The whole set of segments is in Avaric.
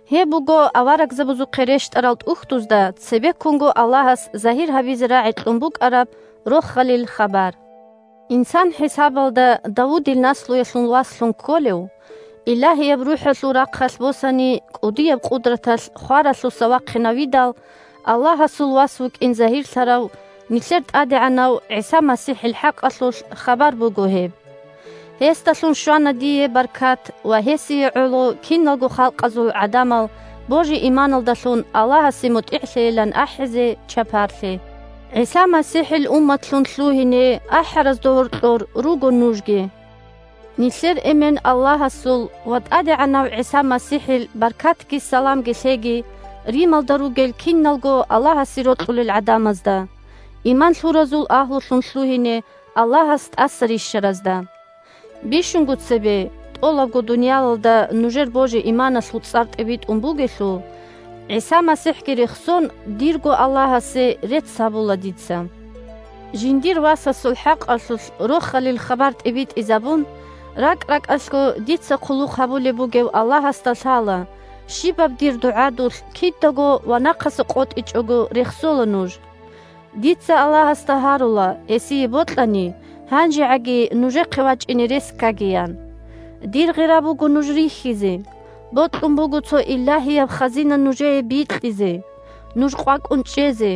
Гьеб буго аварагзабазухъе рещтӀарал ТӀухьдузда цебеккунго Аллагьас загьир гьабизе рагӀи кьун букӀараб Рохалил хабар. Инсан хӀисабалда Давудил наслуялъул васлъун кколев, Илагьияб РухӀалъул рахъалъ босани, кӀудияб къудраталъ хваралъуса вахъинавидал, Аллагьасул вас вукӀин загьирлъарав нилъер ТӀадегӀанав ГӀиса МасихӀил хӀакъалъулъ хабар буго гьеб. Гьесдалъун щвана дие баркат ва гьесие гӀоло киналго халкъазул гӀадамал божи-иманалдалъун Аллагьасе мутӀигӀлъейилан ахӀизе чапарлъи. ГӀиса МасихӀил умматлъун лъугьине ахӀаразда гьоркьор руго нужги. Нилъер Эмен – Аллагьасул ва ТӀадегӀанав ГӀиса МасихӀил баркатги саламги лъеги Рималда ругел киналго Аллагьасе рокьулел гӀадамазда, иман лъуразул агьлулъун лъугьине Аллагьас тӀаса рищаразда! Бищунго цебе – тӀолабго дуниялалда нужер божи-иманалъул цӀар тӀибитӀун бугелъул, ГӀиса МасихӀги рехсон, дирго Аллагьасе рецц гьабула дица. Жиндир Васасул хӀакъалъулъ Рохалил хабар тӀибитӀизабун, ракӀ-ракӀалъго дица хъулухъ гьабулеб бугев Аллагьасда лъала: щибаб дир дугӀадулъ кидаго ва нахъаса къотӀичӀого рехсола нуж. Дица Аллагьасда гьарула, гьесие бокьани, гьанжегӀаги нужехъе вачӀине рес ккагиян. Дир гъира буго нуж рихьизе. Бокьун буго цо илагьияб хазина нужее бикьизе – нуж къвакӀун чӀезе,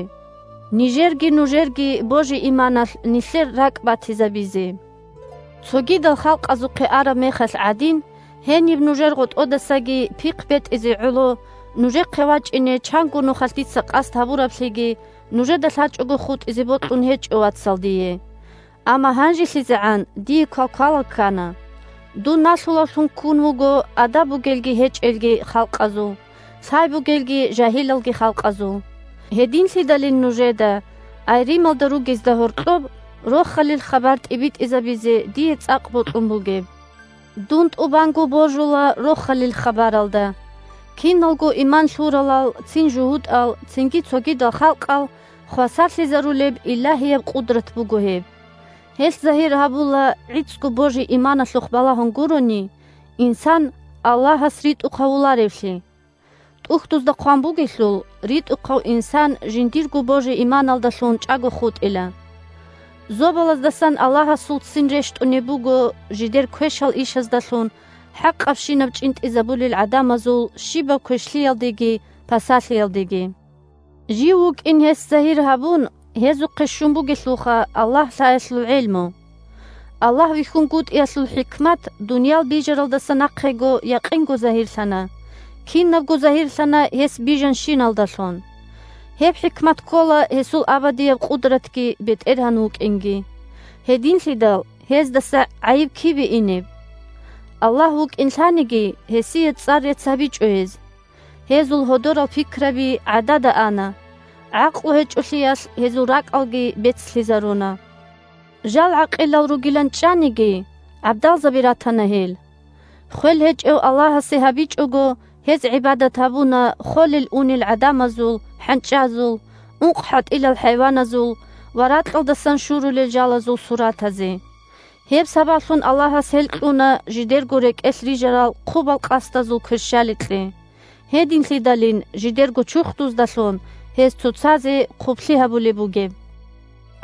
нижерги нужерги божи-иманалъ нилъер ракӀбатизабизе. Цогидал халкъазухъе араб мехалъ гӀадин, гьениб нужер гъотӀодасаги пихъ бетӀизе гӀоло, нужехъе вачӀине чанго нухалъ дица къасд гьабураблъиги нужеда лъачӀого хутӀизе бокьун гьечӀо, вацал, дие. Амма гьанжелъизегӀан дие квалквал ккана. Дун налъулавлъун ккун вуго адаб бугелги гьечӀелги халкъазул, лъай бугелги жагьилалги халкъазул. Гьединлъидалин нужеда, ай Рималда ругезда, гьоркьоб Рохалил хабар тӀибитӀизабизе дие цӀакъ бокьун бугеб. Дун тӀубанго божула Рохалил хабаралда. Киналго иман лъуралал – цин жугьутӀал, цинги цогидал халкъал – хвасарлъизарулеб илагьияб къудрат буго гьеб. Гьелъ загьир гьабула, гӀицӀго божи-иманалъухъ балагьун гурони, инсан Аллагьас ритӀухъ гьавуларевлъи. ТӀухьдузда хъван бугелъул: «РитӀухъав инсан жиндирго божи-иманалдалъун чӀаго хутӀила». Зобалаздасан Аллагьасул ццин рещтӀунеб буго жидер квешал ишаздалъун хӀакъабщинаб чӀинтӀизабулел гӀадамазул щибаб квешлъиялдеги пасалъиялдеги. Жив вукӀин гьес загьир гьабун, гьезухъе щун бугелъулха Аллагь лъаялъул гӀелму. Аллагь вихьунгутӀиялъул хӀикмат дуниял бижаралдаса нахъего якъинго загьирлъана, кинабго загьирлъана гьес бижанщиналдалъун. Гьеб хӀикмат ккола гьесул абадияб къудратги БетӀергьан вукӀинги. Гьединлъидал гьездаса гӀайиб кибе инеб? Аллагь вукӀин лъаниги, гьесие цӀар-рецц гьабичӀо гьез. Гьезул гьодорал пикраби гӀадада ана, гӀакълу гьечӀолъиялъ гьезул ракӀалги бецлъизаруна. Жал гӀакъилал ругилан чӀаниги, гӀабдалзаби ратана гьел. Хвел гьечӀев Аллагьасе гьабичӀого, гьез гӀибадат гьабуна холел-унел гӀадамазул, хӀанчӀазул, ункъхӀатӀилал хӀайваназул ва ракьалдасан шурулел жалазул суратазе. Гьеб сабаблъун Аллагьас гьел кьуна жидерго рекӀелъ рижарал хъубал къасдазул кверщаликье, – гьединлъидалин жидерго чурхдуздалъун гьез цоцазе хъублъи гьабулеб бугеб.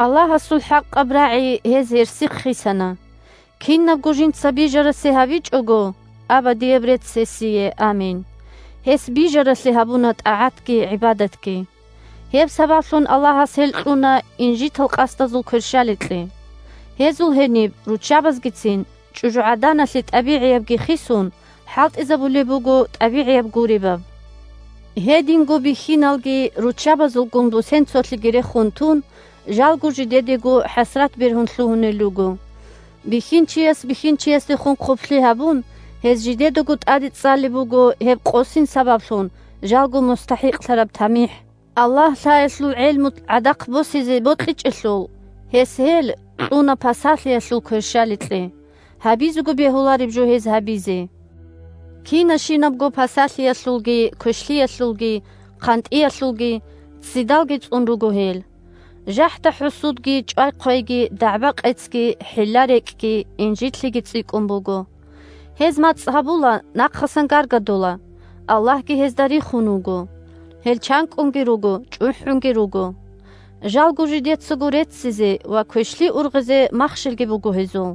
Аллагьасул хӀакъаб рагӀи гьез гьерсихъ хисана. Кинабго жинца бижарасе гьабичӀого (Абадияб рецц гьесие, амин!), гьес бижаралъе гьабуна тӀагӀатги гӀибадатги. Гьеб сабаблъун Аллагьас гьел кьуна инжитал къасдазул кверщаликье. Гьезул гьениб руччабазгицин, чӀужугӀаданалъе тӀабигӀиябги хисун, хӀалтӀизабулеб буго тӀабигӀияб гуребаб. Гьединго бихьиналги, руччабазулгун бусен цолъиги рехун тун, жалго жидедего хӀасрат бергьун лъугьунел руго. Бихьинчияс бихьинчиясдехун хъублъи гьабун, гьез жидедаго тӀаде цӀалеб буго гьеб къосин сабаблъун жалго мустахӀикълъараб тамихӀ. Аллагь лъаялъул гӀелму гӀадахъ босизе бокьичӀелъул, гьес гьел кьуна пасалъиялъул кверщаликье, – гьабизего бегьулареб жо гьез гьабизе. Кина-щинабго пасалъиялъулги, квешлъиялъулги, хъантӀиялъулги, ццидалги цӀун руго гьел. ЖахӀда-хӀусудги, чӀвай-хъвейги, дагӀба-къецги, хӀилла-рекӀкӀги, инжитлъиги цӀикӀкӀун буго. Гьез мацӀ гьабула, нахъасан гаргадула, Аллагьги гьезда рихун вуго. Гьел чанкӀкӀунги руго, чӀухӀунги руго. Жалго жидецаго реццизе ва квешлъи ургъизе махщелги буго гьезул,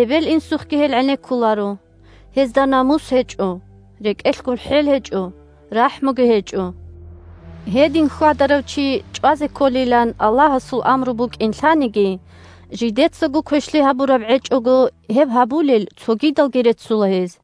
эбел-инсухъги гьел гӀенеккуларо. Гьезда намус гьечӀо, рекӀелъ гурхӀел гьечӀо, рахӀмуги гьечӀо. Гьедин хьвадарав чи чӀвазе кколилан Аллагьасул амру букӀин лъаниги, жидецаго квешлъи гьабураб гӀечӀого, гьеб гьабулел цогидалги реццула гьез.